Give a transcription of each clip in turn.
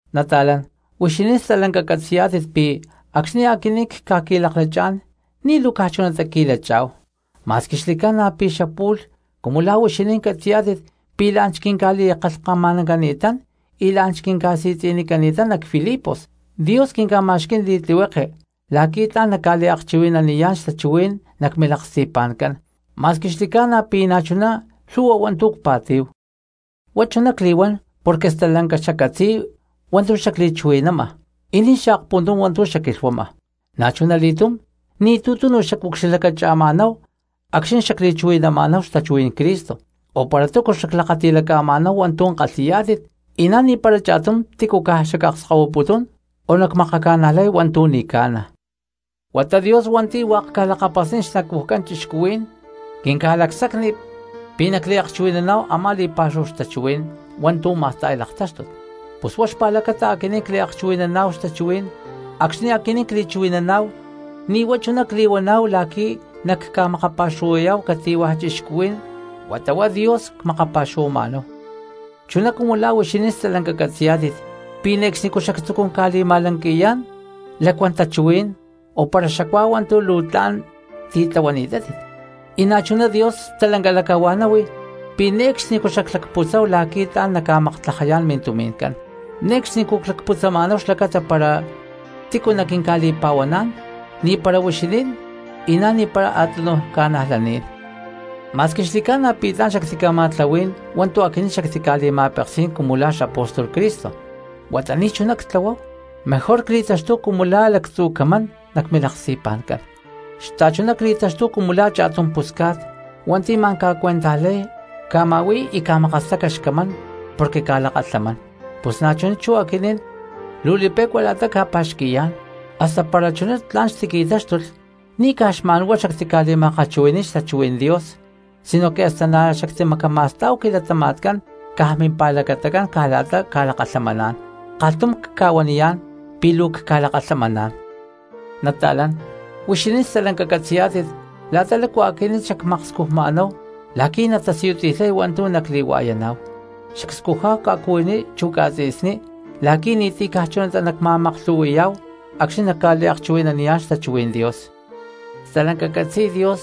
Nata̠lán, huixinín stalanca catzi̠yá̠tit pi̠ acxni̠ aquinín cca̠qui̠laklachá̠n ni̠ luu caj chunatá cqui̠lachá̠hu. Ma̠squi xli̠ca̠na pi̠ xapu̠lh cumu la̠ huixinín catzi̠yá̠tit pi̠ la̠n xquinca̠li̠kalhkama̠nani̠tán y la̠n quinca̠si̠tzi̠nini̠tán nac Filipos, Dios quinca̠ma̠xquí̠n li̠tlihueke la̠qui̠ tla̠n nacca̠liakchuhui̠naniyá̠n xtachuhuí̠n nac milaksti̠pa̠ncán, ma̠squi xli̠ca̠na pi̠ na̠chuná lhu̠hua hua̠ntu̠ cpa̠tí̠hu. Huá chuná cli̠huán porque stalanca xaccatzi̠y hua̠ntu̠ xacliakchuhui̠nama y ni̠ xaakpuntum hua̠ntu̠ xacquilhuama, na̠chuna li̠túm ni̠tu̠ tunu xacucxilhlacacha̠ma̠náhu acxni̠ xacli̠chuhui̠nama̠náhu xtachuhuí̠n Cristo o para túcu xaclakati̠laca̠ma̠náhu hua̠ntu̠ kalhi̠yá̠tit y na̠ ni̠para cha̠tum tícu caj xacakskahuiputún o nacmakaca̠najlay hua̠ntu̠ ni̠ ca̠na. Huata Dios hua̠nti̠ hua̠k ca̠lakapasniy xnacujcán cristianos quinca̠li̠lacsacni pi̠ nacliakchuhui̠naná̠hu a̠má li̠pa̠xúhu xtachuhuí̠n hua̠ntu̠ ma̠sta̠y laktáxtut. ¡Pus huá xpa̠lacata aquinín cliakchuhui̠naná̠hu xtachuhuí̠n! Acxni̠ aquinín cli̠chuhui̠naná̠hu ni̠ huá chuná cli̠huaná̠hu la̠qui̠ nacca̠makapa̠xuhuayá̠hu cati̠hua̠ cristiano huata huá Dios cmakapa̠xuhuama̠náhu. Chuná cumu la̠ huixinín stalanca catzi̠yá̠tit pi̠ ne̠cxnicú xactzucún ca̠li̠ma̠lanqui̠yá̠n lacuán tachuhuí̠n o para xacuáhu hua̠ntu̠ luu tla̠n titlahuani̠tátit, y na̠chuná Dios stalanca lacahua̠náhui pi̠ ne̠cxnicú xaclacputzáhu la̠qui̠ tla̠n nacca̠maktlajayá̠n mintumi̠ncán. Ne̠cxnicú clacputzama̠náhu xlacata para tícu naquinca̠li̠pa̠huaná̠n, ni̠para huixinín y na̠ ni̠para a̠túnuj cristianos. Ma̠squi xli̠ca̠na pi̠ tla̠n xactica̠ma̠tlahuí̠n hua̠ntu̠ aquinín xactica̠li̠ma̠peksí̠n cumu la̠ xapóstol Cristo, huata ni̠chuná ctlahuáhu, mejor cli̠taxtúhu cumu la̠ lactzu̠ camán nac milaksti̠pa̠ncán, xta̠chuná cli̠taxtúhu cumu la̠ cha̠tum pusca̠t hua̠nti̠ ma̠n ca̠cuentajtlahuay, ca̠ma̠hui̠y y ca̠makastaca xcamán porque ca̠lakalhamán. Pus na̠chuná chú aquinín luu li̠pe̠cua la̠ta cca̠pa̠xqui̠yá̠n, hasta para chuná tla̠n xtiqui̠táxtulh ni̠ caj xma̠n huá xactica̠li̠ma̠kalhchuhui̠ní̠n xtachuhuí̠n Dios sinoque hasta na̠ xactimacama̠stá̠hu quilatama̠tcán caj mimpa̠lacatacán caj la̠ta cca̠lakalhamaná̠n. ¡Kalhtum cca̠huaniyá̠n pi̠ luu cca̠lakalhamaná̠n! Nata̠lán, huixinín stalanca catzi̠yá̠tit la̠ta lácu aquinín xacmakscujma̠náhu la̠qui̠ natasiyuti̠lhay hua̠ntu̠ nacli̠hua̠yaná̠hu; xacscujá̠hu ca̠cuhuiní chu ca̠tzi̠sní la̠qui̠ ni̠ti̠ caj chunatá nacma̠maklhu̠hui̠yá̠hu acxni̠ nacca̠liakchuhui̠naniyá̠n xtachuhuí̠n Dios. Stalanca catzi̠y Dios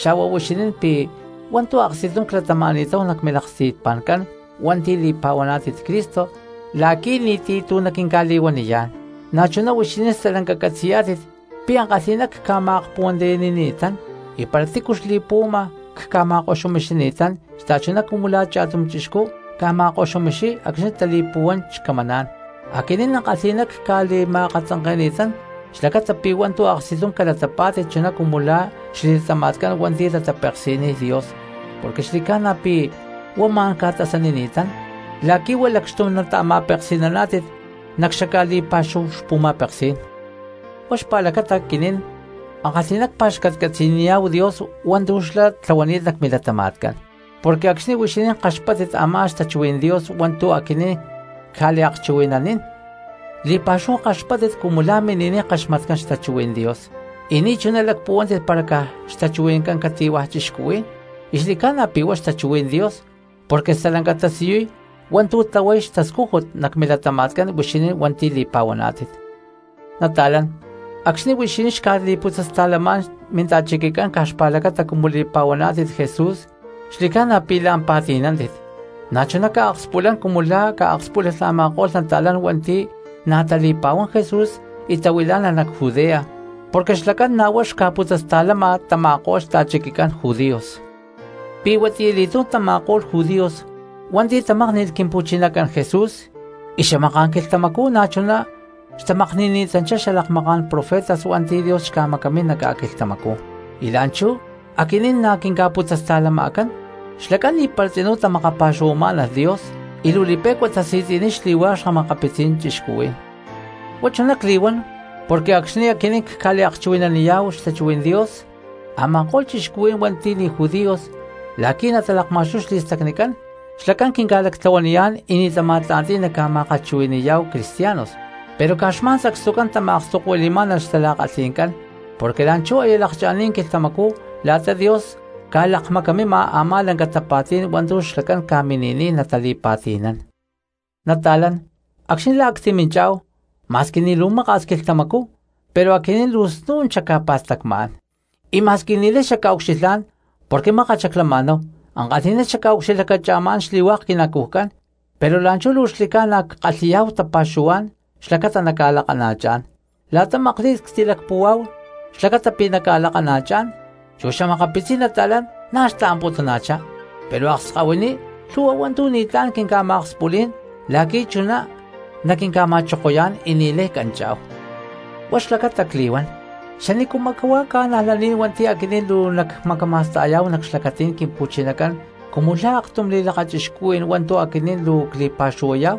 xa̠hua huixinín pi̠ hua̠ntu̠ aksti̠tum clatama̠ni̠táhu nac milaksti̠pa̠ncán hua̠nti̠ li̠pa̠huaná̠tit Cristo la̠qui̠ ni̠ti̠ tu̠ naquinca̠li̠huaniyá̠n. Na̠chuná huixinín stalanca catzi̠yá̠tit pi̠ ankalhi̠ná cca̠ma̠kpuhuantiyani̠ni̠tán, y para tícu xli̠puhuama cca̠ma̠koxumixini̠tán xta̠chuná cumu la̠ cha̠tum chixcú ca̠ma̠koxumixiy acxni̠ tali̠puhuán xcamaná̠n. Aquinín ankalhi̠ná cca̠li̠ma̠akatzanke̠ni̠tán xlacata pi̠ hua̠ntu̠ aksti̠tum calatapá̠tit chuná cumu la̠ xli̠latama̠tcán hua̠nti̠ tatapeksi̠niy Dios, porque xli̠ca̠na pi̠ huá ma̠n ca̠tasanini̠tán la̠qui̠ huá lacxtum nata̠ma̠peksi̠naná̠tit nac xaca̠li̠pa̠xúhu xpu̠ma̠peksí̠n. Huá xpa̠lacata aquinín ankalhi̠ná cpa̠xcatcatzi̠niyá̠hu Dios hua̠ntu̠ xlá tlahuani̠t nac milatama̠tcán, porque acxni̠ huixinín kaxpáttit a̠má xtachuhuí̠n Dios hua̠ntu̠ aquinín cca̠liakchuhui̠nanín li̠pa̠xúhu kaxpáttit cumu la̠ mini̠niy kaxmatcán xtachuhuí̠n Dios, y ni̠chuná lacpuhuántit para caj xtachuhui̠ncán cati̠hua̠ cristiano. Y xli̠ca̠na pi̠ huá xtachuhuí̠n Dios porque stalanca tasiyuy hua̠ntu̠ tlahuay xtascújut nac milatama̠tcán huixinín hua̠nti̠ li̠pa̠huaná̠tit. Nata̠lán, acxni̠ huixinín xca̠li̠putzasta̠lamá̠n minta̠chiquicán caj xpa̠lacata cumu li̠pa̠huaná̠tit Jesús xli̠ca̠na pi̠ la̠n pa̠ti̠nántit, na̠chuná ca̠akspulán cumu la̠ ca̠akspúlalh a̠ma̠ko̠lh nata̠lán hua̠nti̠ na̠ tali̠pa̠huán Jesús y tahuilá̠nalh nac Judea, porque xlacán na̠ huá xca̠putzasta̠lama tama̠ko̠lh xta̠chiquicán judíos. Pi̠huatiyali̠túm tama̠ko̠lh judíos hua̠nti̠ tamákni̠lh Quimpu̠chinacán Jesús y xamaká̠n quilhtamacú na̠chuná xtamakni̠ni̠tanchitá xalakmaká̠n profetas hua̠nti̠ Dios xca̠macamín nac ca̠quilhtamacú, y la̠nchú aquinín na̠ quinca̠putzasta̠lama̠cán. Xlacán ni̠para tzinú tamakapa̠xuhuamá̠nalh Dios, y luu li̠pe̠cua tasi̠tzi̠niy xli̠hua̠k xa̠makapitzí̠n cristianos. Huá chuná cli̠huán porque acxni̠ aquinín cca̠liakchuhui̠naniyá̠hu xtachuhuí̠n Dios a̠ma̠ko̠lh cristianos hua̠nti̠ ni̠ judíos la̠qui̠ na̠ natalakma̠xtuy xli̠stacnicán, xlacán quinca̠lactlahuaniyá̠n y ni̠ tama̠tla̠nti̠y nacca̠ma̠kalhchuhui̠ní̠yá̠hu cristianos. Pero caj xma̠n sacstucán xtama̠akstokuili̠má̠nalh xtala̠kalhi̠ncán porque la̠nchú aya lakcha̠ni̠t quilhtamacú la̠ta Dios ca̠lakmacamima a̠má lanca tapa̠tí̠n hua̠ntu̠ xlacán ca̠mini̠niy natali̠pa̠ti̠nán. Nata̠lán, acxni̠ la̠ a̠ ctiminchá̠hu ma̠squi ni̠ luu maka̠s quilhtamacú pero aquinín luu snu̠n xacca̠pa̠stacmá̠n, y ma̠squi ni̠lay xacca̠ucxilhá̠n porque mákat xaclama̠náhu, ankalhi̠ná xacca̠ucxilhlaca̠ma̠chá̠n xli̠hua̠k quinacujcán, pero la̠nchú luu xli̠ca̠na ckalhi̠yá̠hu tapa̠xuhuá̠n xlacata nacca̠lakana̠chá̠n. La̠ta makli̠t ctilacpúhua xlacata pi̠ nacca̠lakana̠chá̠n chu xa̠makapitzí̠n nata̠lán na̠ xtaamputuna̠chá pero akskahuiní lhu̠hua hua̠ntu̠ ni̠tlá̠n quinca̠ma̠akspulí̠n la̠qui̠ chuná naquinca̠ma̠chokoyá̠n y ni̠lay canchá̠hu. Huá xlacata cli̠huán, ¿xanícuma̠ cristianos hua̠nti̠ aquinín luu nacca̠macama̠sta̠yá̠hu nac xlacatí̠n Quimpu̠chinacán cumu la̠ aktum li̠lakachixcuhuí̠n hua̠ntu̠ aquinín luu cli̠pa̠xuhuayá̠hu?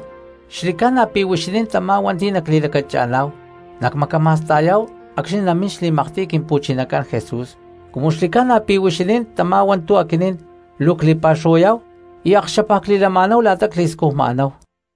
¡Xli̠ca̠na pi̠ huixinín tamá hua̠nti̠ nacli̠lacacha̠ná̠hu nacmacama̠sta̠yá̠hu acxni̠ namín xli̠maktiy Quimpu̠chinacán Jesús! Cumu xli̠ca̠na pi̠ huixinín tamá hua̠nti̠ aquinín luu cli̠pa̠xuhuayá̠hu y akxapa cli̠lama̠náhu la̠ta cli̠scujma̠náhu.